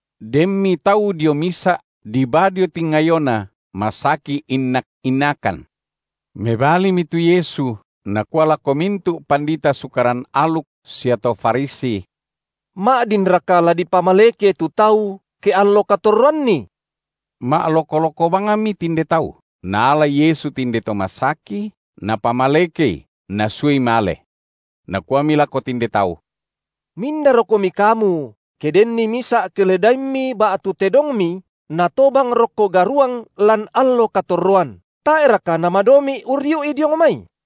Denmi tau dio misa’ dibaa dio tingayoNa, masaki innak-innakan. Mebalimi tu Yesu, Nakua lako mintu’ pandita Sukaran aluk sia to Farisi: Ma’dinraka la dipamaleke tu tau ke allo katorroanni? Ma’loko-loko bangmi tinde tau. Naalai Yesu tinde to masaki, Napamalekei, Nasuai male. Nakuami lako tinde tau: Mindarokomi kamu ke denni misa’ keledaimmi ba’tu tedongmi natobang rokko garuang lan allo katorroan, tae’raka namadomi’ urriu’i diong mai?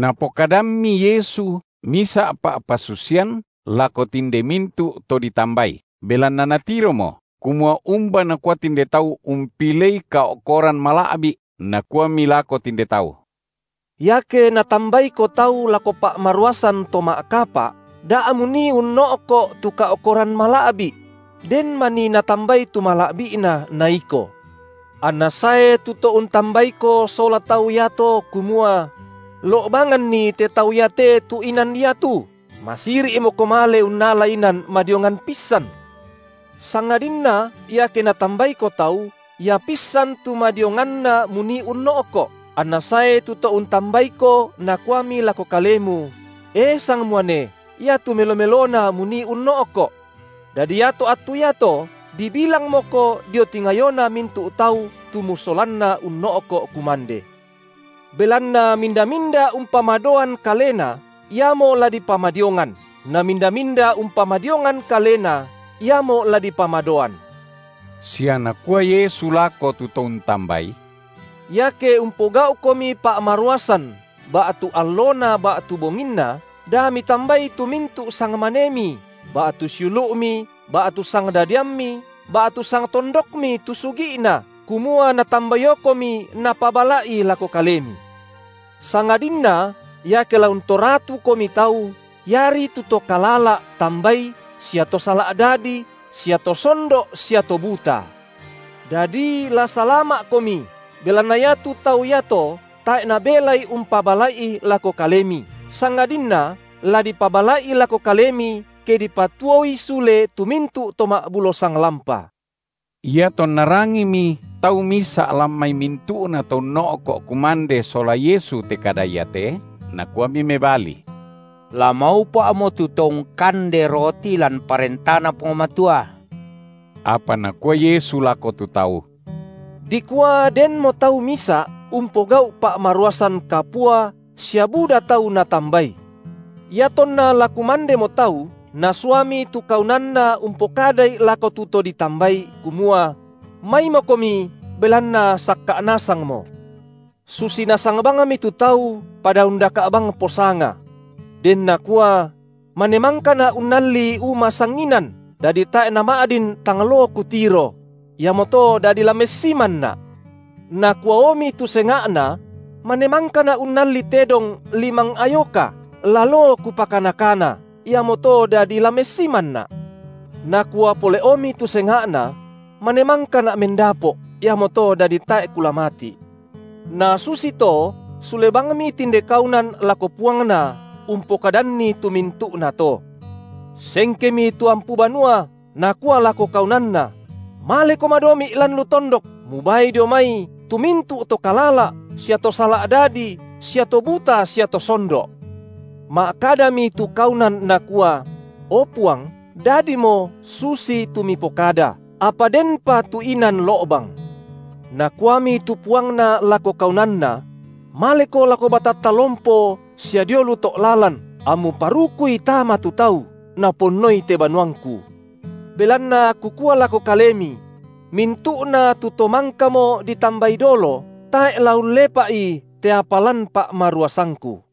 Napokadammi Yesu misa’ pa’pasusian lako tinde mintu’ to ditambai, belanna Natiromo, kumua umba nakua tinde tau umpilei kao’koran mala’bi’, Nakuami lako tinde tau: Iake natambaiko tau lako pa’maruasan to ma’kapa’, da munii unno’ko’ tu kao’koran mala’bi’; den manii natambai tu mala’bi’na na iko. Anna sae tu to untambaiko sola tau iato, kumua: Lo’banganni te tau iate tu inan iatu, masiri’moko male unnala inan madiongan pissan. Sangadinna iake natambaiko tau, ia pissan tu madionganna munii unno’ko’, anna sae to tu to untambaiko nakuami lako kalemu: E sangmuane, iatu melo-melona munii unno’ko’. Dadi iato attu iato, dibilangmoko dio tingayona mintu’ tau tu musolanna unno’ko’ kumande. Belanna minda-minda umpamadoan kalena, iamo la dipamadiongan, na minda-minda umpamadiongan kalena, iamo la dipamadoan. Sia Nakua Yesu lako tu to untambai: Iake umpogau’komi pa’maruasan ba’tu allona ba’tu bonginna, da mitambai tu mintu’ sangmanemi, ba’tu siulu’mi, ba’tu sangdadiammi, ba’tu sangtondokmi tu sugi’na, kumua natambaiokomi napabala’i lako kalemi. Sangadinna iake la untoratukomi tau, iari tu to kalala’ tambai sia to sala’ dadi, sia to sondo’ sia to buta. Dadi la salama’komi, belanna iatu tau iato tae’ nabelai umpabala’i lako kalemi, sangadinna la dipabala’i lako kalemi ke dipatuoi sule tu mintu’ to ma’bulo sanglampa. Iatonna rangimi tau misa’ lan mai mintu’na to unno’ko’ kumande sola Yesu te kada iate, nakuami mebali: La maupa’mo tu to ungkande roti lan ParentaNa Puang Matua. Apa Nakua Yesu lako tu tau: Dikua denmo tau misa’ umpogau’ pa’maruasan kapua sia buda tau natambai. Iatonna la kumandemo tau, nasuami tu kaunanna umpokadai lako tu to ditambai, kumua: Maimokomi, belanna sakka’ nasangmo. Susi nasang bangmi tu tau pada undaka’ bang posanga. Den nakua: Mane mangkana’ unnalli uma sanginan, dadi tae’ nama’din tang loo kutiro; iamoto dadi la messimanna’. Nakuaomi tu senga’na: Mane mangkana’ unnalli tedong limang ayoka, la loo kupakana-kana, iamoto dadi la messimanna’. Nakua pole’omi tu senga’na: Mane mangkana’ mendapo’, iamoto dadi tae’ kula mati’. Nasusito sule bangmi tinde kaunan lako puangna umpokadanni tu mintu’nato. Sengkemi tu ampu banua, nakua lako kaunanna: Maleko madomi’ lan lu tondok, mubaai dio mai tu mintu’ to kalala’ sia to sala’ dadi, sia to buta sia to sondo’. Ma’kadami tu kaunan nakua: O Puang, dadimo susitu mipokada, apa denpa tu inan lo’bang. Nakuami tu Puangna lako kaunanna: Maleko lako batatta lompo sia dio lu to’ lalan, ammu parukui tama tu tau, naponnoi te banuangku; belanna kukua lako kalemi: mintu’na tu to mangkamo ditambai dolo tae’ la ullepa’i te apa lan pa’maruasangku.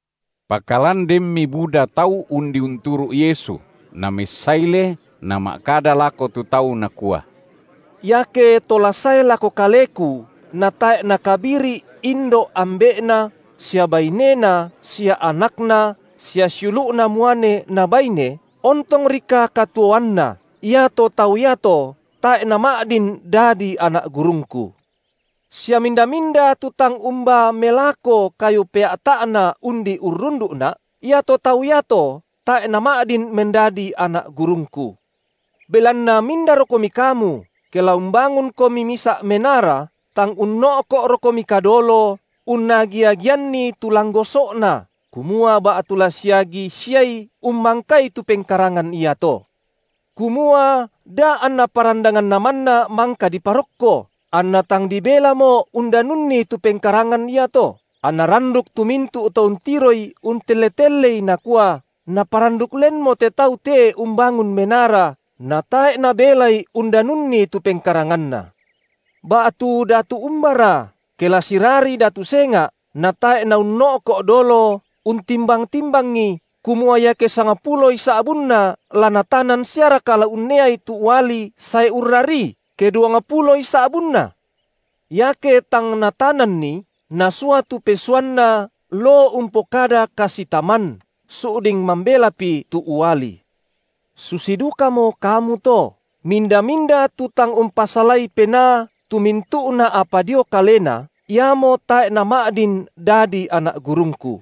Pakalan denmi buda tau undi unturu’ Yesu, Namessaile Nama’kada lako tu tau Nakua: Iake to la sae lako Kaleku natae’ nakabiri’ indo’ ambe’na sia bainena sia anakna sia siulu’na muane na baine, ontongrika katuoanna, iato tau iato tae’ nama’din dadi anak gurungKu. Sia minda-minda tu tang umbaa melako kayu pea’ta’na undi urrundu’Na’, iato tau iato tae’ nama’din mendadi anak gurungKu. Belanna mindarokomi kamu ke la umbangunkomi misa’ menara tang unno’ko’rokomika dolo unnagi-agianni tu langgoso’na, kumua ba’tu la siagi siai ummangkai tu pengkarangan iato? Kumua da anna parandanganna manna mangka diparokko, anna tang dibelamo undanunni tu pengkarangan iato, anna randuk tu mintu’ to untiroi untelle-tellei, nakua: Naparanduk lenmo te tau te umbangun menara, natae’ nabelai undanunni tu pengkaranganna. Ba’tu datu umbara, ke la sirarii datu senga’, natae’ na unno’ko’ dolo untimbang-timbangi, kumua iake sangpuloi sa’bunna la natanan siaraka la unneai tu uali sae urrarii, ke duangpuloi sa’bunna? Iake tang natananni, nasua tu pesuanna loo umpokada kasitaman su’ding mambelapi tu uali. Susi dukamo kamu to, minda-minda tu tang umpasalai penaa tu mintu’na apa dio kalena, iamo tae’ nama’din dadi anak gurungKu.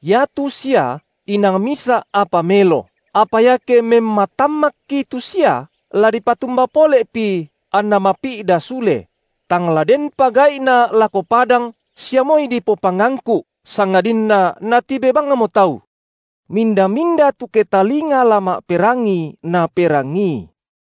Iatu sia inang misa’ apa melo, apa iake memmatammakki tu sia, la dipatumba pole’pi anna mapi’da sule? Tang la denpa gai’na lako padang sia moi dipopangangku’, sangadinna natibe bangmo tau. Minda-minda tu ketalinga la ma’perangi, naperangii.